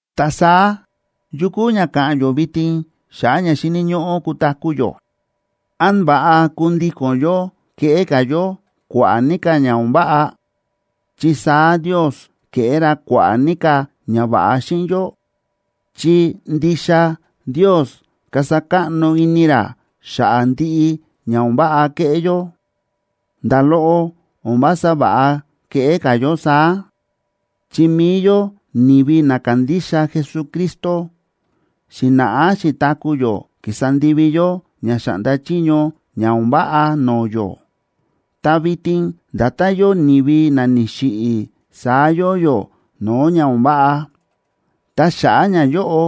Ta saá, ¿yu kúu ña ka̱ꞌa̱n yó vitin xa̱ꞌa̱ ña xíni̱ ñóꞌó kutaku̱ yó? ¿Án va̱ꞌa kundíko̱n yó keꞌé ka̱ yó kua̱ꞌa̱ ní ka̱ ña o̱n váꞌa, chi saá Ndios keꞌé ra kua̱ꞌa̱ ní ka̱ ñava̱ꞌa xíꞌin yó? Chi ndixa Ndios kasa káꞌno ini ra xa̱ꞌa̱ ndiꞌi ña o̱n váꞌa keꞌé yó. ¡Nda̱ loꞌo o̱n vása va̱ꞌa keꞌé ka̱ yó saá! Chi mi̱i yó ni̱vi na kándixa Jesucristo, xi̱na̱ꞌá xi̱taku̱ yó kísa ndivi yó ña xáꞌnda chiño ña o̱n váꞌa no̱o̱ yó. Ta vitin nda̱tán yóo ni̱vi na ni̱xiꞌi̱, saá yóo yó no̱o̱ ña o̱n váꞌa, ta xa̱ꞌa̱ ñayóꞌo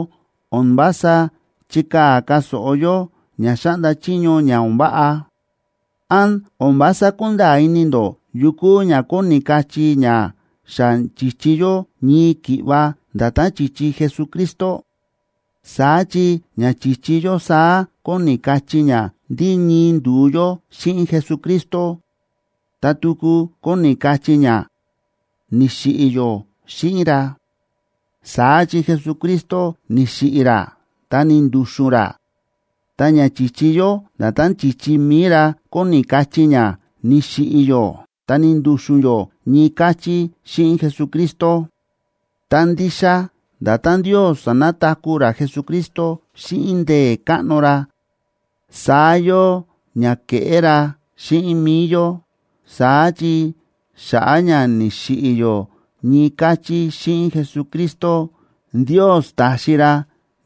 o̱n vása chíkaa̱ ka̱ so̱ꞌo yó ña xáꞌnda chiño ña o̱n váꞌa. ¿Án o̱n vása kúnda̱a̱ ini ndó yu kúu ña kóni kachí ña xa chi̱chi yó ñii ki̱ꞌva nda̱tán chi̱chi Jesucristo? Saá chi ña chi̱chi yó saá kóni kachí ña ndí ñii ndu̱u yó xíꞌin Jesucristo, ta tuku kóni kachí ña ni̱xiꞌi̱ yó xíꞌin ra. Saá chi Jesucristo ni̱xiꞌi̱ ra ta ni̱ndu̱xu̱n ra. Ta ña chi̱chi yó nda̱tán chi̱chi mi̱i ra kóni kachí ña ni̱xiꞌi̱ yó ta ni̱ndu̱xu̱n yó ñii káchí xíꞌin Jesucristo. Ta ndixa nda̱tán Ndios sa̱nataku̱ ra Jesucristo xíꞌin ndee̱ káꞌno ra, saá yóo ña keꞌé ra xíꞌin mi̱i yó. Saá chi xa̱ꞌa̱ ña ni̱xiꞌi̱ yó ñii káchí xíꞌin Jesucristo, Ndios ta̱xi ra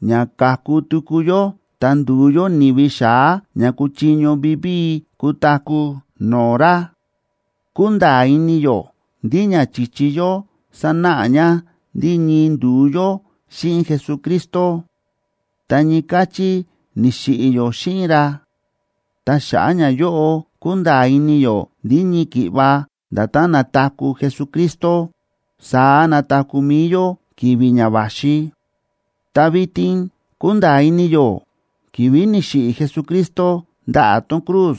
ña ka̱ku tuku yó ta ndu̱u yó ni̱vi xa̱á na kúchiño vivíi kutaku̱ no̱o̱ ra. Kúnda̱a̱ ini yó ndí ña chi̱chi yó sánáꞌa ña ndí ñii ndu̱u yó xíꞌin Jesucristo, ta ñii káchí ni̱xiꞌi̱ yó xíꞌin ra. Ta xa̱ꞌa̱ ñayóꞌo kúnda̱a̱ ini yó ndí ñii ki̱ꞌva nda̱tán na̱taku̱ Jesucristo, saá nataku̱ mi̱i yó ki̱vi̱ ña va̱xi. Ta vitin kúnda̱a̱ ini yó ki̱vi̱ ni̱xiꞌi̱ Jesucristo ndaꞌa̱ tón cruz,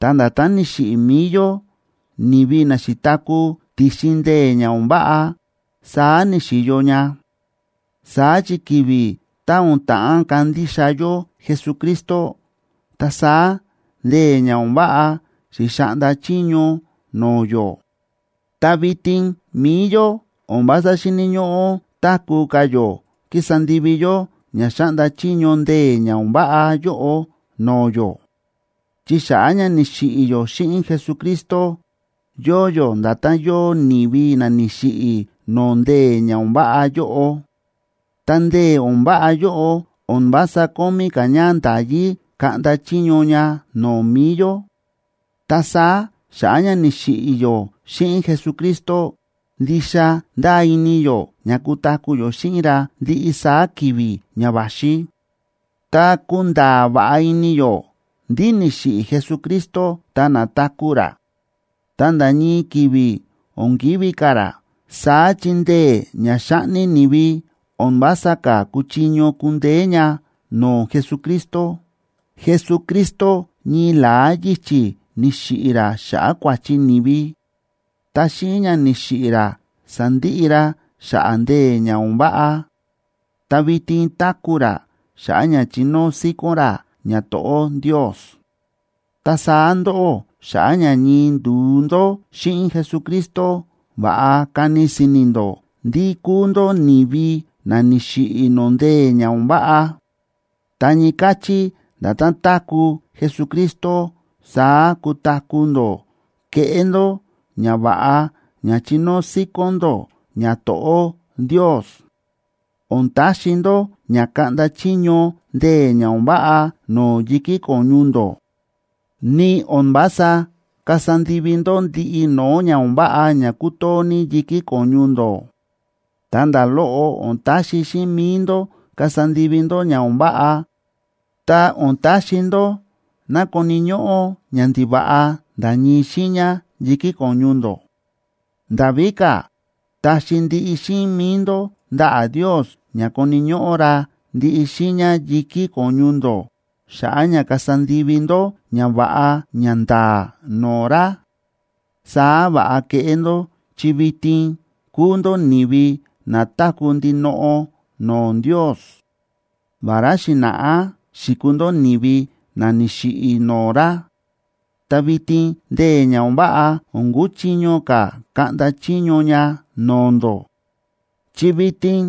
ta nda̱tán ni̱xiꞌi̱ mi̱i yó, ni̱vi na xi̱taku̱ ti̱xin ndee̱ ña o̱n váꞌa, saá ni̱xi̱yo ña. Saá chi ki̱vi̱ tá o̱n ta̱ꞌán kandixa yó Jesucristo, ta saá ndee̱ ña o̱n váꞌa xi̱xaꞌnda chiño no̱o̱ yó. Ta vitin mi̱i yó o̱n vása xíni̱ ñóꞌó táku̱ ka̱ yó kísa ndivi yó ña xáꞌnda chiño ndee̱ ña o̱n váꞌa yóꞌo no̱o̱ yó. Chi xa̱ꞌa̱ ña ni̱xiꞌi̱ yó xíꞌin Jesucristo, yóo yó nda̱tán yóo ni̱vi na ni̱xiꞌi̱ no̱o̱ ndee̱ ña o̱n váꞌa yóꞌo, ta ndee̱ o̱n váꞌa yóꞌo o̱n vása kómí ka̱ ña nda̱yí kaꞌnda chiño ña no̱o̱ mi̱i yó. Ta saá xa̱ꞌa̱ ña ni̱xiꞌi̱ yó xíꞌin Jesucristo, ndixa ndáa ini yó ña kutaku̱ yó xíꞌin ra ndiꞌi saá ki̱vi̱ ña va̱xi. Ta kúnda̱a̱ va̱ꞌa ini yó ndí ni̱xiꞌi̱ Jesucristo ta na̱taku̱ ra, ta nda̱ ñii ki̱vi̱ o̱n kivi̱ ka̱ ra. Saá chi ndee̱ ña xáꞌni ni̱vi o̱n vása ka̱ kúchiño kundeé ña no̱o̱ Jesucristo. Jesucristo ñii la̱á yichi̱ ni̱xiꞌi̱ ra xa̱ꞌa̱ kua̱chi ni̱vi, ta xíꞌin ña ni̱xiꞌi̱ ra sa̱ndiꞌi ra xa̱ꞌa̱ ndee̱ ña o̱n váꞌa. Ta vitin táku̱ ra xa̱ꞌa̱ ña chinóo síkón ra ñato̱ꞌó Ndios. Ta saá ndóꞌó, xa̱ꞌa̱ ña ñii ndu̱u ndó xíꞌin Jesucristo, va̱ꞌa kani si̱ni̱ ndó ndí kúu ndó ni̱vi na ni̱xiꞌi̱ no̱o̱ ndee̱ ña o̱n váꞌa. Ta ñii káchí nda̱tán táku̱ Jesucristo, saá kutaku̱ ndó keꞌé ndó ñava̱ꞌa ña chinóo síkón ndó ñato̱ꞌó Ndios. O̱n taxi ndó ña kaꞌnda chiño ndee̱ ña o̱n váꞌa no̱o̱ yi̱kí ko̱ñu ndó, ni o̱n vása kasa ndivi ndó ndiꞌi no̱o̱ ña o̱n váꞌa ña kútoo ní yi̱kí ko̱ñu ndó. Ta nda̱ loꞌo o̱n taxi xíꞌin mi̱i ndó kasa ndivi ndó ña o̱n váꞌa, ta o̱n taxi ndó ná koni̱ ñóꞌó ñandiva̱ꞌa nda̱ ñii xiiña yi̱kí ko̱ñu ndó. Nda̱ víka̱, taxi ndiꞌi xíꞌin mi̱i ndó ndaꞌa̱ Ndios ña koni̱ ñóꞌó ra ndiꞌi xiiña yi̱kí ko̱ñu ndó xa̱ꞌa̱ ña kasa ndivi ndó ñava̱ꞌa ñanda̱a̱ no̱o̱ ra. Saá va̱ꞌa keꞌé ndó chi vitin kúu ndó ni̱vi na táku̱ ndinoꞌo no̱o̱ Ndios, vará xi̱na̱ꞌá xi̱kuu ndó ni̱vi na ni̱xiꞌi̱ no̱o̱ ra. Ta vitin ndee̱ ña o̱n váꞌa o̱n kuchiño ka̱ kaꞌnda chiño ña no̱o̱ ndó. Chi vitin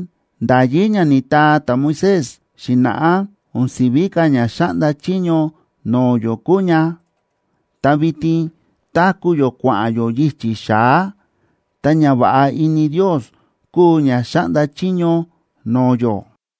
nda̱yí ña ni̱taa ta̱Moisés xi̱na̱ꞌá o̱n si̱ví ka̱ ña xáꞌnda chiño no̱o̱ yó kúu ña, ta vitin táku̱ yó kua̱ꞌa̱n yó yichi̱ xa̱á, ta ñava̱ꞌa ini Ndios kúu ña xáꞌnda chiño no̱o̱ yó.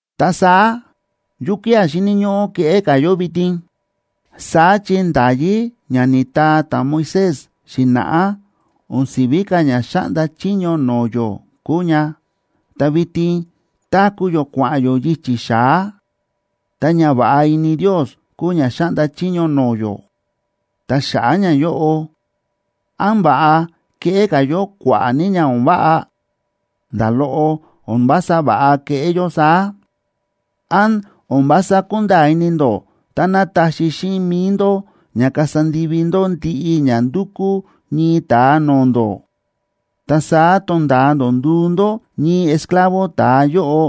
Ta saá, ¿yukía̱ xíni̱ ñóꞌó keꞌé ka̱ yó vitin? Saá chi nda̱yí ña ni̱taa ta̱Moisés xi̱na̱ꞌá o̱n si̱ví ka̱ ña xáꞌnda chiño no̱o̱ yó kúu ña, ta vitin táku̱ yó kua̱ꞌa̱n yó yichi̱ xa̱á, ta ñava̱ꞌa ini Ndios kúu ña xáꞌnda chiño no̱o̱ yó. Ta xa̱ꞌa̱ ñayóꞌo, ¿án va̱ꞌa keꞌé ka̱ yó kua̱ꞌa̱ ní ña o̱n váꞌa? ¡Nda̱ loꞌo o̱n vása va̱ꞌa keꞌé yó saá! ¿Án o̱n vása kúnda̱a̱ ini ndó táná taxi xíꞌin mi̱i ndó ña kasa ndivi ndó ndiꞌi ña ndúkú ñii ta̱a no̱o̱ ndó, ta saá tonda̱a ndó nduu ndó ñii esclavo ta̱a yóꞌo,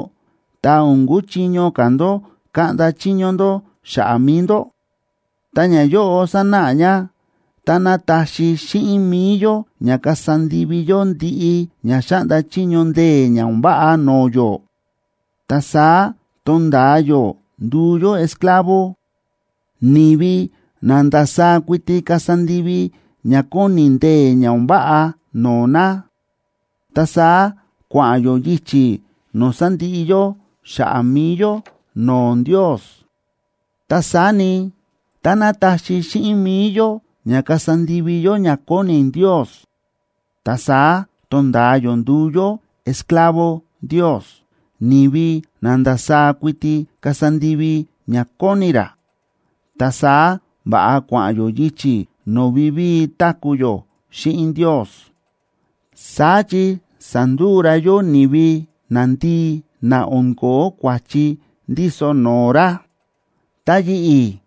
ta o̱n kuchiño ka̱ ndó kaꞌnda chiño ndó xa̱ꞌa̱ mi̱i ndó? Ta ñayóꞌo sánáꞌa ña táná taxi xíꞌin mi̱i yó ña kasa ndivi yó ndiꞌi ña xáꞌnda chiño ndee̱ ña o̱n váꞌa no̱o̱ yó, ta saá tonda̱a yó nduu yó esclavo, ni̱vi na ndasaá kuiti kasa ndivi ña kóni ndee̱ ña o̱n váꞌa no̱o̱ na, ta saá kua̱ꞌa̱n yó yichi̱ no̱o̱ sandiꞌi yó xa̱ꞌa̱ mi̱i yó no̱o̱ Ndios. Ta saá ni, táná taxi xíꞌin mi̱i yó ña kasa ndivi yó ña kóni Ndios, ta saá tonda̱a yó nduu yó esclavo Ndios, ni̱vi na ndasaá kuiti kasa ndivi ña kóni ra, ta saá va̱ꞌa kua̱ꞌa̱n yó yichi̱ no̱o̱ vivíi táku̱ yó xíꞌin Ndios, saá chi sa̱nduu ra yó ni̱vi nandii na o̱n ko̱ó kua̱chi ndíso no̱o̱ ra. ¡Ta yi̱ꞌi̱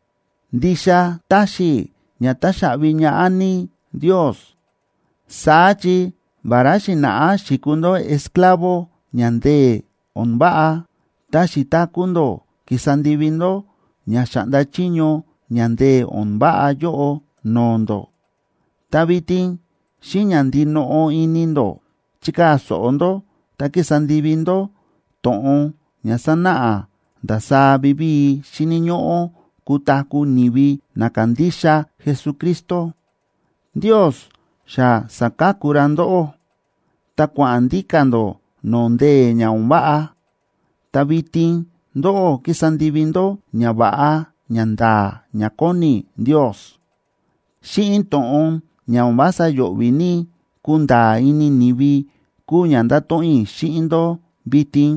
ndixa táxi i̱ ña táxaꞌvi ñaꞌá ní Ndios! Saá chi vará xi̱na̱ꞌá xi̱kuu ndó esclavo ña ndee̱ o̱n váꞌa, ta xi̱taku̱ ndó kísa ndivi ndó ña xáꞌnda chiño ña ndee̱ o̱n váꞌa yóꞌo no̱o̱ ndó, ta vitin xíꞌin ña ndinoꞌo ini ndó chíkaa̱ so̱ꞌo ndó ta kísa ndivi ndó to̱ꞌon ña sánáꞌa ndasaá vivíi xíni̱ ñóꞌó kutaku̱ ni̱vi na kándixa Jesucristo. Ndios xa sa̱ka̱ku ra ndóꞌó, ta kua̱ꞌa̱n ndíka̱ ndó no̱o̱ ndee̱ ña o̱n váꞌa, ta vitin ndóꞌó kísa ndivi ndó ñava̱ꞌa ñanda̱a̱ ña kóni Ndios. Xíꞌin to̱ꞌon ña o̱n vása yo̱ꞌvi̱ ní kunda̱a̱ ini ni̱vi kúu ña ndato̱ꞌon i̱ xíꞌin ndó vitin,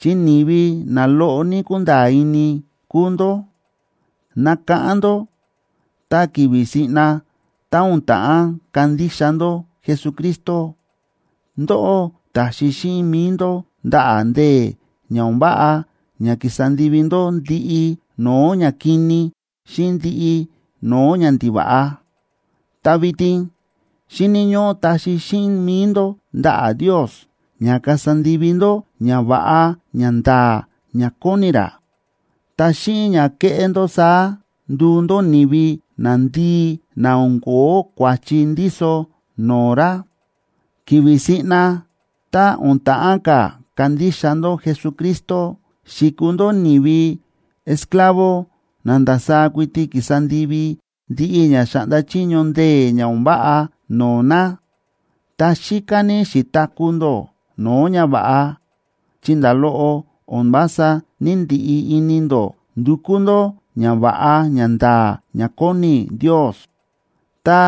chi ni̱vi na loꞌo ní kúnda̱a̱ ini kúu ndó. Nákáꞌán ndó tá ki̱vi̱ siꞌna ta o̱n ta̱ꞌán kandixa ndó Jesucristo, ndóꞌó ta̱xi xíꞌin mi̱i ndó ndaꞌa̱ ndee̱ ña o̱n váꞌa ña ki̱sa ndivi ndó ndiꞌi no̱o̱ ñakini xíꞌin ndiꞌi no̱o̱ ñandiva̱ꞌa. Ta vitin xíni̱ ñóꞌó taxi xíꞌin mi̱i ndó ndaꞌa̱ Ndios ña kasa ndivi ndó ñava̱ꞌa ñanda̱a̱ ña kóni ra. Ta xíꞌin ña kéꞌé ndó saá nduu ndó ni̱vi nandii na o̱n ko̱ó kua̱chi ndíso no̱o̱ ra. Ki̱vi̱ siꞌna tá o̱n ta̱ꞌán ka̱ kandixa ndó Jesucristo, xi̱kuu ndó ni̱vi esclavo na ndasaá kuiti ki̱sa ndivi ndiꞌi ña xáꞌnda chiño ndee̱ ña o̱n váꞌa no̱o̱ na, ta xíká ní xi̱taku̱ ndó no̱o̱ ñava̱ꞌa, chi nda̱ loꞌo o̱n vása ní‑ndiꞌi ini ndó ndukú ndó ñava̱ꞌa ñanda̱a̱ ña kóni Ndios. Ta,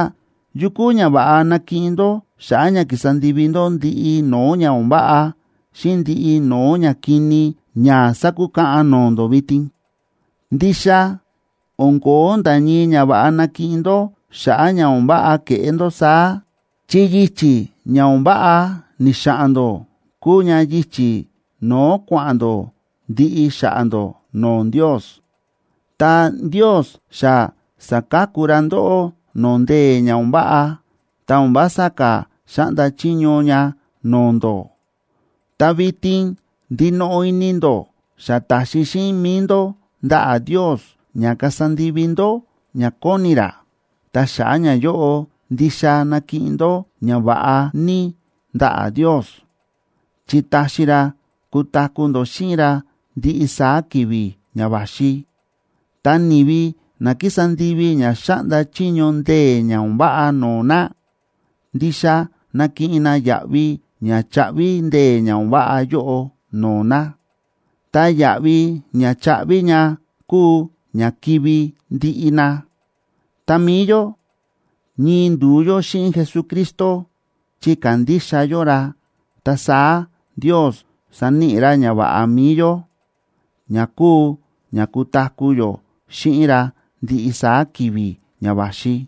¿yu kúu ñava̱ꞌa na̱kiꞌin ndó xa̱ꞌa̱ ña ki̱sa ndivi ndó ndiꞌi no̱o̱ ña o̱n váꞌa, xíꞌin ndiꞌi no̱o̱ ñakini ña sákukaꞌan no̱o̱ ndó vitin? Ndixa o̱n ko̱ó nda̱ ñii ñava̱ꞌa na̱kiꞌin ndó xa̱ꞌa̱ ña o̱n váꞌa ke̱ꞌé ndó saá, chi yichi̱ ña o̱n váꞌa ni̱xa̱ꞌa̱n ndó kúu ña yichi̱ no̱o̱ kua̱ꞌa̱n ndó ndiꞌi xa̱ꞌa̱ ndó no̱o̱ Ndios. Ta Ndios xa sa̱ka̱ku ra ndóꞌó no̱o̱ ndee̱ ña o̱n váꞌa, ta o̱n vása ka̱ xáꞌnda chiño ña no̱o̱ ndó. Ta vitin ndinoꞌo ini ndó xa ta̱xi xíꞌin mi̱i ndó ndaꞌa̱ Ndios ña kasa ndivi ndó ña kóni ra. Ta xa̱ꞌa̱ ñayóꞌo ndixa nakiꞌin ndó ñava̱ꞌa ní ndaꞌa̱ Ndios, chi taxi ra kutaku̱ ndó xíꞌin ra ndiꞌi saá ki̱vi̱ ña va̱xi. Ta ni̱vi na kísa ndivi ña xáꞌnda chiño ndee̱ ña o̱n váꞌa no̱o̱ na, ndixa nakiꞌin na yaꞌvi ña chaꞌvi ndee̱ ña o̱n váꞌa yóꞌo no̱o̱ na. Ta yaꞌvi ña cháꞌvi ña kúu ña kivi̱ ndiꞌi na. Ta mi̱i yó, ñii ndu̱u yó xíꞌin Jesucristo chi kándixa yó ra, ta saá Ndios saníꞌi ra ñava̱ꞌa mi̱i yó, ña kúu ña kutaku̱ yó xíꞌin ra ndiꞌi saá ki̱vi̱ ña va̱xi.